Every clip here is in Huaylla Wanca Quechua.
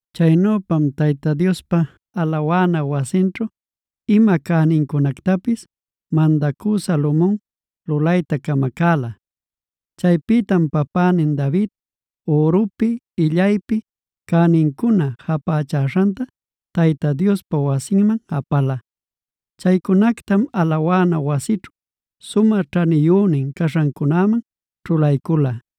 Chaynüpam Tayta Diospa alawana wasinćhu ima cänincunactapis mandacü Salomon lulayta camacäla. Chaypïtam papänin David ürupi illaypi cänincuna japächaśhantaa Tayta Diospa wasinman apala. Chaycunactam alawana wasićhu sumä ćhaniyünin caśhancunäman ćhulaycula.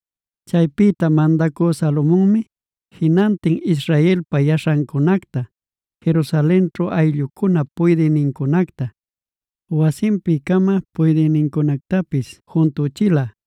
Chaypïta mandacü Salomonmi jinantin israelpa yaśhancunacta, Jerusalenćhu ayllucunap puydïnincunacta, wasinpi-cama puydïnincunactapis juntüchila.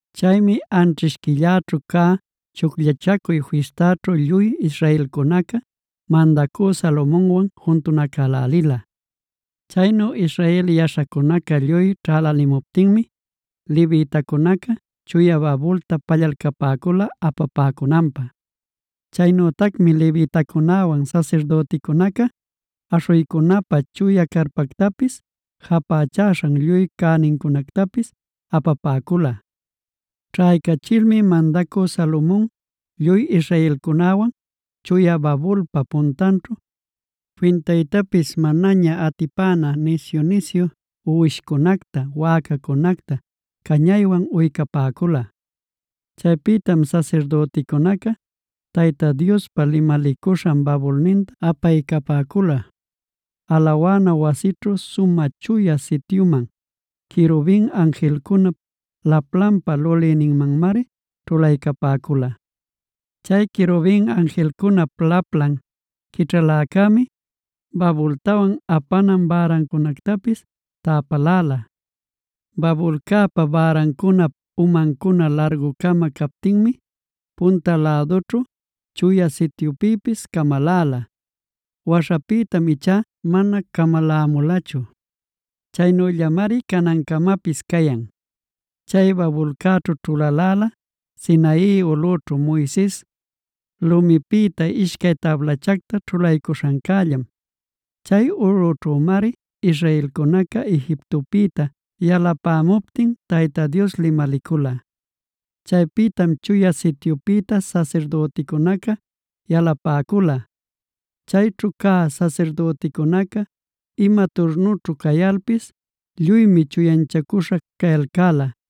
Chaymi anćhish quillaćhu cä Chucllachacuy Fistaćhu lluy israelcunaca mandacü Salomonwan juntunacälälila. Chaynu Israel yaśhacunaca lluy ćhälälimuptinmi levitacunaca, chuya babulta pallalcapäcula apapäcunanpä. Chaynütacmi levitacunäwan sasirdüticunaca aśhuycunapä chuya carpactapis, japächaśhan lluy cänincunactapis apapäcula. Ćhaycachilmi mandacü Salomon lluy israelcunäwan, chuya babulpa puntanćhu, fintaytapis manaña atipäna nisyu-nisyu uwishcunacta, wäcacunacta cañaywan uycapäcula. Chaypïtam sasirdüticunaca Tayta Diospa limalicuśhan babulninta apaycapäcula, alawana wasićhu Sumä Chuya Sityuman; querubin anjilcunap laplanpa lulïninmanmari ćhulaycapäcula. Chay querubin anjilcunap laplan quićhaläcämi babultawan apanan bärancunactapis täpaläla. Babulcäpa bärancunap umancuna largu-cama captinmi punta lädućhu Chuya Sityupïpis camaläla. Waśhapïtam ichá mana camalämulachu; chaynüllamari canancamapis cayan. Chay babulcäćhu ćhulaläla, Sinai ulꞌućhu Moises lumipïta ishcay tablachacta ćhulaycuśhancällam.c Chay ulꞌućhümari israelcunaca Egiptopïta yalapämuptin Tayta Dios limalicula. Chaypïtam Chuya Sityupïta sasirdüticunaca yalapäcula. Chayćhu cä sasirdüticunaca ima turnućhu cayalpis lluymi chuyanchacüśha cayalcäla.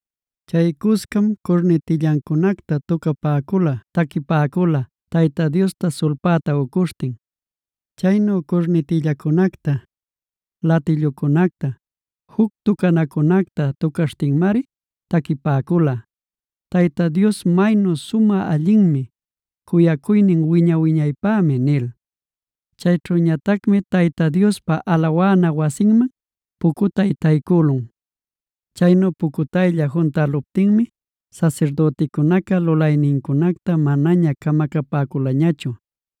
Chay cuscam curnitillancunacta tucapäcula taquipäcula Tayta Diosta sulpäta ucuśhtin. Chaynu curnitillacunacta, latillucunacta, juc tucanacunacta tucaśhtinmari taquipäcula: “Tayta Dios maynu sumä allinmi; cuyacuynin wiña-wiñaypämi” nil.d Chayćhüñatacmi Tayta Diospa alawana wasinman pucutay taycülun. Chaynu pucutaylla juntäluptinmi sasirdüticunaca lulaynincunacta manaña camacapäculañachu.